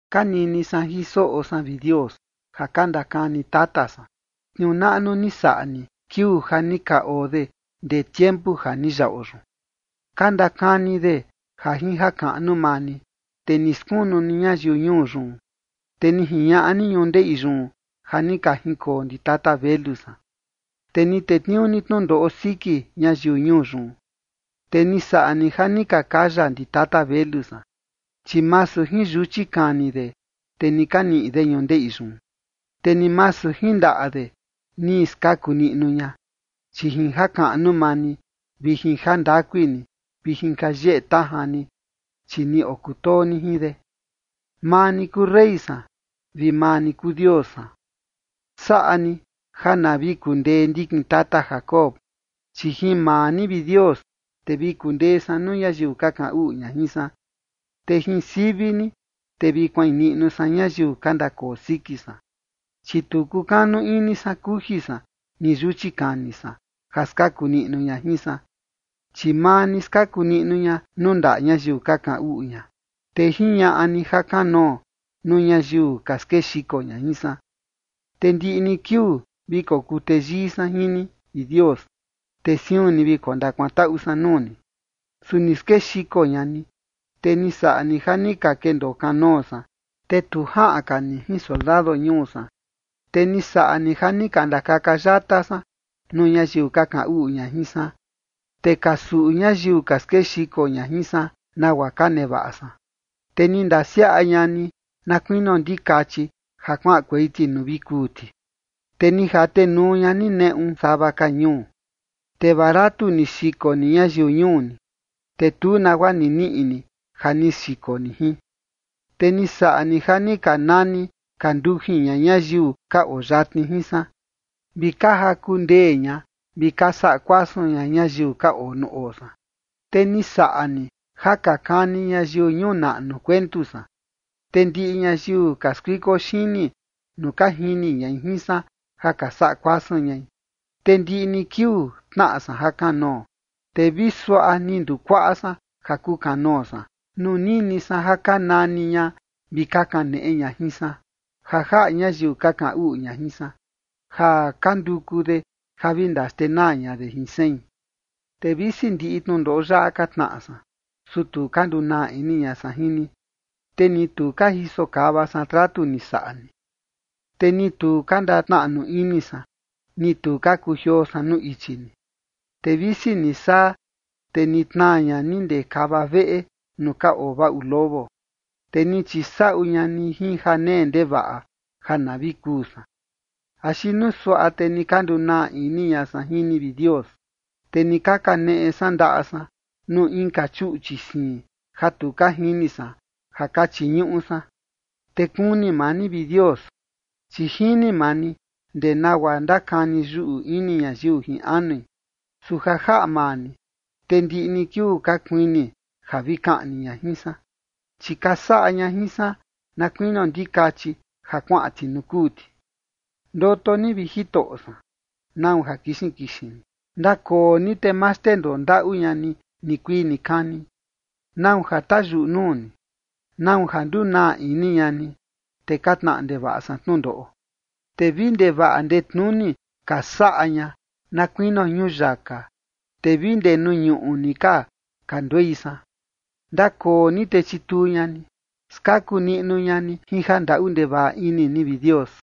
Ka nini san jin soꞌo san, vi Dios, ja ka ndakani tata san tniuu naꞌnu ni saꞌa ni kiuu ja ni ka oo de ndee tiempu ja ni yaꞌo yun. Ka ndakani de ja jin jakaꞌnu maa ni, te ni skunu ni ñayiu ñuu yun, te ni jiñaꞌa ni ñundeꞌi yun ja ni ka jinkoo ndi tata velu san, te ni tetniuu ni tnundoꞌo siki ñayiu ñuu yun, te ni saꞌa ni ja ni ka kaya ndi tata velu san. Chi masu jin yuchi kani de, te ni ka niꞌi de ñundeꞌi yun, te ni masu jin ndaꞌa de ni skaku niꞌnu ña, chi jin jakaꞌnu maa ni vi jin jandakui ni vi jin ja yeꞌe tajan ni, chi ni okutoo ni jin de. Maa ni kuu rey san, vi maa ni kuu Dios san. Saꞌa ni ja na vi kundee ndikin tata Jacob. Chi jin maa ni, vi Dios, te vi kundee san nuu ñayiu ka kaꞌan uꞌu ña jin san, te jin sivi ni, te vi kuain niꞌnu san ñayiu ka ndakoo siki san. Chi tu kukanu ini san kuji san ni yuchi kani san ja skaku niꞌnu ña jin san. Chi maa ni skaku niꞌnu ña nuu ndaꞌa ñayiu ka kaꞌan uꞌu ña, te jiñaꞌa ni ja kanoo nuu ñayiu ka skexiko ña jin san. Te ndiꞌi ni kiuu vi kokuu teyii san jin ni, vi Dios, te siun ni vi kondakuantaꞌu san nuu ni. Su ni skexiko ña ni, te ni saꞌa ni ja ni ka kendoo kanoo san, te tu jaꞌan ka ni jin soldado ñuu san. Te ni saꞌa ni ja ni ka ndakaka yata san nuu ñayiu ka kaꞌan uꞌu ña jin san, te ka suꞌu ñayiu ka skexiko ña jin san nagua ka nevaꞌa san. Te ni ndasiaꞌa ña ni na kuinio ndikachi ja kuaꞌankuei ti nuu vi kuu ti, te ni jatenuu ña ni neꞌu sava ka ñuu. Te baratu ni xiko ni ñayiu ñuu ni, te tu nagua ni niꞌi ni ja ni xiko ni jin. Te ni saꞌa ni ja ka nani ka ndujin ña ñayiu ka oo yatni jin san, vi ka jaku ndee ña vi ka saꞌa kuasun ña ñayiu ka oo nuu oo san. Te ni saꞌa ni ja ka kani ñayiu ñuu naꞌnu kuentu san, te ndiꞌi ñayiu ka skuiko xini nuu ka jini ñai jin san ja ka saꞌa kuasun ñai. Te ndiꞌi ni kiuu tnaꞌa san jakanoo, te vi suaꞌa ni ndukuaꞌa san ja kukanoo san, nuu nini san ja ka nani ña vi ka kaneꞌe ña jin san ja jaꞌa ñayiu ka kaꞌan uꞌu ña jin san ja ka nduku de ja vi ndaxtenaa ña de jin sein. Te visi ndiꞌi tnundoꞌo yaꞌa ka tnaꞌa san, su tu ka ndunaa ini ña san jin ni, te ni tu ka jiso kava san tratu ni saꞌa ni. Te ni tu ka ndatnaꞌnu ini san, ni tu ka kujioo san nuu ichi ni. Te visi ni saa, te ni tnaa ña ni ndee kava veꞌe nuu ka oo vaꞌu lobo, te ni chisaꞌu ña ni jin janee ndevaꞌa ja na vi kuu san. Axi nuu suaꞌa te ni ka ndunaa ini ña san jin ni, vi Dios, te ni ka kaneꞌe san ndaꞌa san nuu inka chuꞌchi siin ja tu ka jini san ja ka chiñuꞌu san, te kuni maa ni, vi Dios, chi jini maa ni ndee nagua ndakani yuꞌu ini ñayiu jin anui. Su ja jaꞌa maa ni, te ndiꞌi ni kiuu ka kuini ja vi kaꞌni ña jin san, chi ka saꞌa ña jin san na kuinio ndikachi ja kuaꞌan ti nuu kuu ti. Ndoto ni, vi Jitoꞌo san. ¿Nau ja kixin kixin ni? Ndakoo ni te ma xndendoo ndaꞌu ña ni nikuii nikani. ¿Nau ja tayuꞌu nuu ni? ¿Nau ja ndunaa ini ña ni, te ka tnaꞌa ndevaꞌa san tnundoꞌo? Te vi ndevaꞌa ndetnuni ka saꞌa ña, na kuinio ñuyaka, te vi ndee nuu ñuꞌu ni ka kanduei san. Ndakoo ni te chituu ña ni. Skaku niꞌnu ña ni jin jandaꞌu ndevaꞌa ini ni, vi Dios.